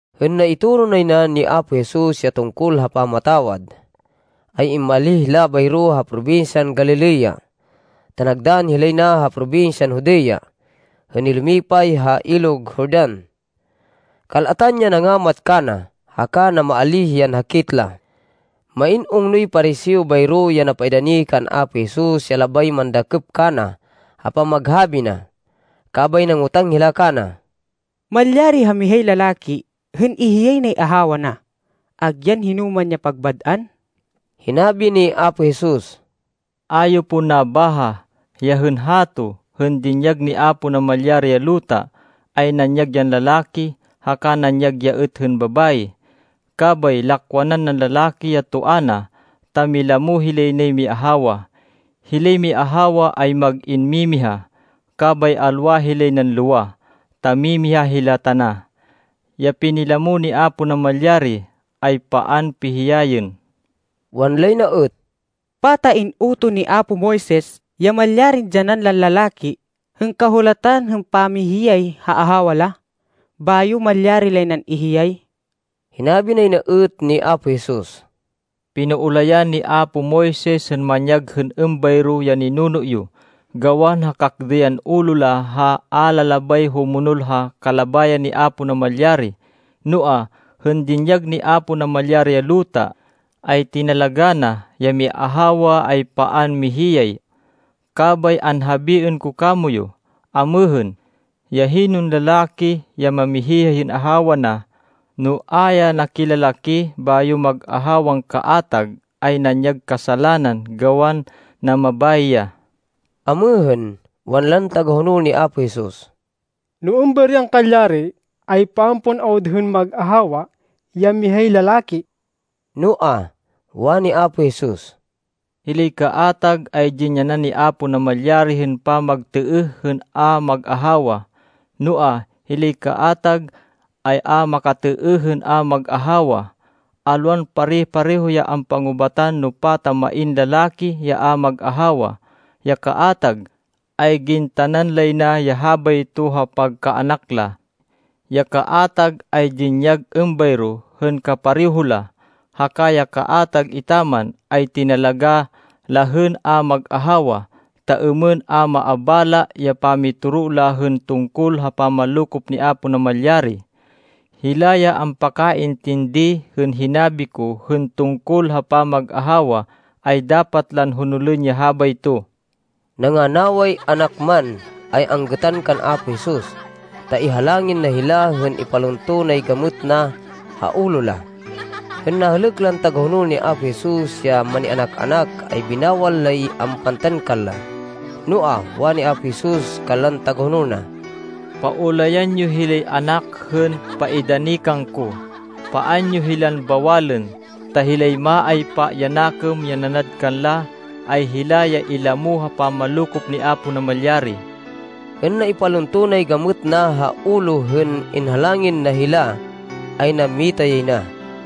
Hên naitoro nay na ni Apo Jesus ya tungkol ha pamatawad, ay immalíh hila bayro ha probinsyan Galilea, ta nagdann hilay na ha probinsyan Judea, hên nilumipay ha Ilog Jordan. Kal-atan ya nangamat kana, haka namaalíh yan hakit la. Main ungnoy Pariseo bayro ya napaidani kan Apo Jesus ya labay mandakêp kana ha pamaghabi na. Kabay nangotang hila kana, “Malyari ha mihay lalaki hên ihiyay nay ahawa na, agyan hinoman ya pagbad-an?” Hinabi hi Apo Jesus, “A yo pon nabaha, ya hên hato, hên dinyag ni Apo Namalyari ya luta, ay nanyag yan lalaki, haka nanyag ya êt hên babayi? Kabay lakwanan nan lalaki ya toa na, ta milamo hilay nay miahawa. Hilay miahawa ay mag-in mimiha, kabay alwa hilay nan lowa, ta mimiha hila tana. Ya pinilamo ni Apo Namalyari, ay paan pihiyayên.” Wanlay na êt, “Pata in-utoh ni apo Moises ya malyarin dyanan lan lalaki hên kahulatan hên pamihiyay ha ahawa la, bayo malyari lay nan ihiyay?” Hinabi nay na êt ni Apo Jesus, “Pinaulayan ni apo Moises hên manyag hên êmbayro, ya ninuno yo, gawan ha kakdêyan ulo la ha a la labay humonol ha kalabayan ni Apo Namalyari. Noa, hên dinyag ni Apo Namalyari ya luta, ay tinalagá na ya miahawa ay paan mihiyay. Kabay anhabiên ko kamoyu amêhên, ya hinon lalaki ya mamihiyay hên ahawa na, no a ya nakilalaki, bayo mag-ahawan kaatag, ay nanyag kasalanan gawan namabayi ya.” Amêhên, wanlan tagahonol ni Apo Jesus, “No êmbayroy angkalyari, ay paan pon awud hên mag-ahawa ya mihay lalaki.” Noa, wani Apo Jesus, “Hilay kaatag ay dinyanan ni Apo Namalyari hên pamagtêêh hên a mag-ahawa, noa, hilay kaatag ay a makatêêh hên a mag-ahawa. Alwan pare-pareho ya ampangubatan no pata main lalaki ya a mag-ahawa. Ya kaatag, ay gintanan lay na ya habayto ha pagkaanak la. Ya kaatag ay dinyag êmbayro hên kapareho la. Haka ya kaatag, etaman ay tinalagá la hên a mag-ahawa, ta êmên a maabala ya pamitoro la hên tungkol ha pamanlokop ni Apo Namalyari. Hila ya ampakaintindi hên hinabi ko hên tungkol ha pamag-ahawa, ay dapat lan honolên ya habayto.” Nanganaway anak man, ay anggêtan kan Apo Jesus, ta ihalangin na hila hên ipalunto nay gamêt na ha ulo la. Hên nahêlêk lan tagahonol ni Apo Jesus ya manianak-anak ay binawal lay ampantan kanla. Noa, wani Apo Jesus kanlan tagahonol na, “Paulayan yo hilay anak hên paidani kangko. Paan yo hilan bawalên. Ta hilay maaypa ya nakêm ya nanad kanla, ay hila ya ilamo ha pamanlokop ni Apo Namalyari.” Hên naipalunto nay gamêt na ha ulo hên inhalangin na hila, ay nammita yay na.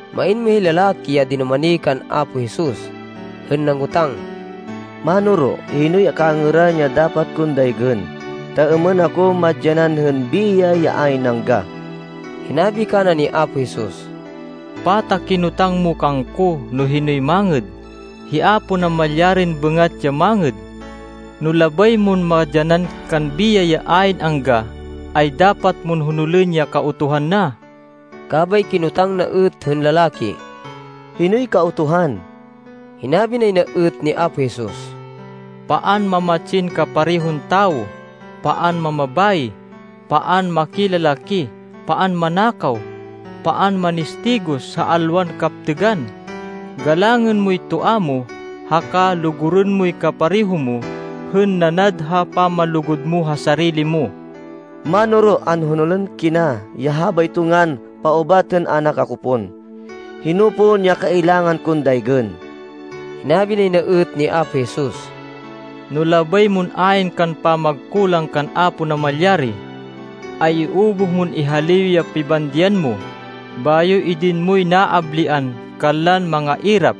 Main mihay lalaki ya dinumani kan Apo Jesus, hên nangotang, “Mánoro, hinoy kangêran ya dapat kon daygên, ta êmên ako madyanan hên biyay ya ayn angga?” Hinabi kana ni Apo Jesus, “Pata kinotang mo kangko no hinoy mangêd? Hi Apo Namalyarin bêngat ya mangêd. No labay mon madyanan kan biyay ya ayn angga, ay dapat mon honolên ya Kautuhan na.” Kabay kinotang na êt hên lalaki, “Hinoy Kautuhan?” Hinabi nay na êt ni Apo Jesus, “Paan mamatsin kaparehon tawo. Paan mamabayi. Paan makilalaki. Paan manakaw. Paan manistigos ha alwan kaptêgan. Galangên moy toa mo, haka lugurên moy kapareho mo hên nanad ha pamanlugud mo ha sarili mo.” “Mánoro, anhonolên kina ya habayto ngan paubat hên anak ako pon. Hino pon ya kailangan kon daygên?” Hinabi nay na êt ni Apo Jesus, “No labay mon ayn kan pamagkulang kan Apo Namalyari, ay iubuh mon ihaliw ya pibandian mo, bayo idin moy naablian kanlan mangairap,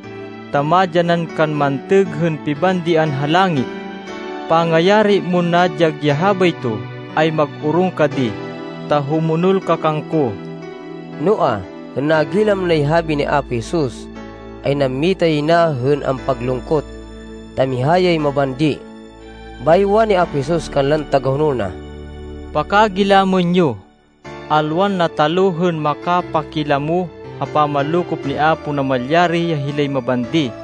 ta madyanan kan mantêg hên pibandian ha langit. Pangayari mon nadyag ya habayto, ay mag-orong ka di, ta humonol ka kangko.” Noa, hên nagilam nay habi ni Apo Jesus, ay nammita yay na hên ampaglungkot, ta miha yay mabandi. Bayo wani Apo Jesus kanlan tagahonol na, “Pakagilamên yo! Alwan nataluh hên makapakilamo ha pamanlokop ni Apo Namalyari ya hilay mabandi!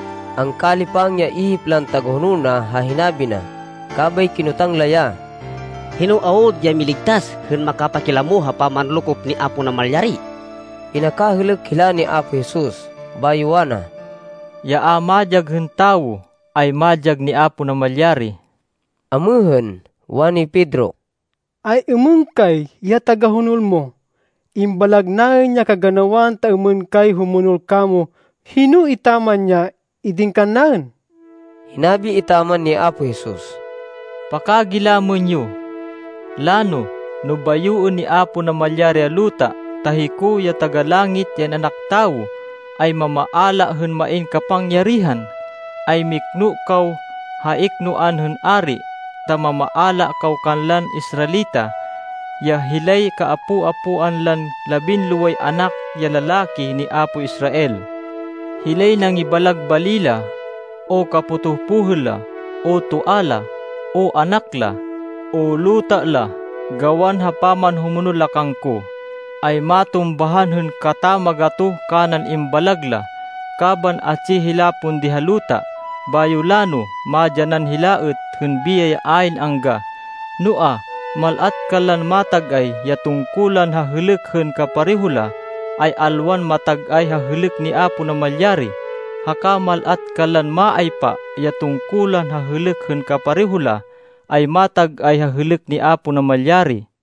Angkalipang ya ihip lan tagahonol na ha hinabi na, kabay kinotang la ya, “Hino awud ya miligtas hên makapakilamo ha pamanlokop ni Apo Namalyari?” Pinakahêlêk hila ni Apo Jesus, bayo wana, “Ya a madyag hên tawo, ay madyag ni Apo Namalyari.” Amêhên, wani Pedro, “Ay-êmên kay, ya tagahonol mo? Imbalag naên ya kaganawan, ta êmên kay humonol kamo. Hino etaman ya idin kannaên?” Hinabi etaman ni Apo Jesus, “Pakagilamên yo! Lano no bayoên ni Apo Namalyari ya luta, ta hiko, ya Taga-Langit, ya In-anak Tawo ay mamaala hên main kapangyarihan, ay mikno kaw ha iknoan hên ari ta mamaala kaw kanlan Israelita, ya hilay kaapo-apoan lan labinloway anak ya lalaki ni apo Israel. Hilay nangibalag bali la, o kapotoh pohêl la, o toa la, o anak la, o luta la, gawan ha pamanhumonol la kangko, ay matumbahan hên katamagatoh kanan imbalag la, kaban atsi hila pon di ha luta. Bayo lano madyanan hila êt hên biyay ya ayn angga. Noa, mal-at kanlan matag-ay ya tungkulan ha hêlêk hên kapareho la, ay alwan matag-ay ha hêlêk ni Apo Namalyari, haka mal-at kanlan maaypa ya tungkulan ha hêlêk hên kapareho la, ay matag-ay ha hêlêk ni Apo Namalyari.”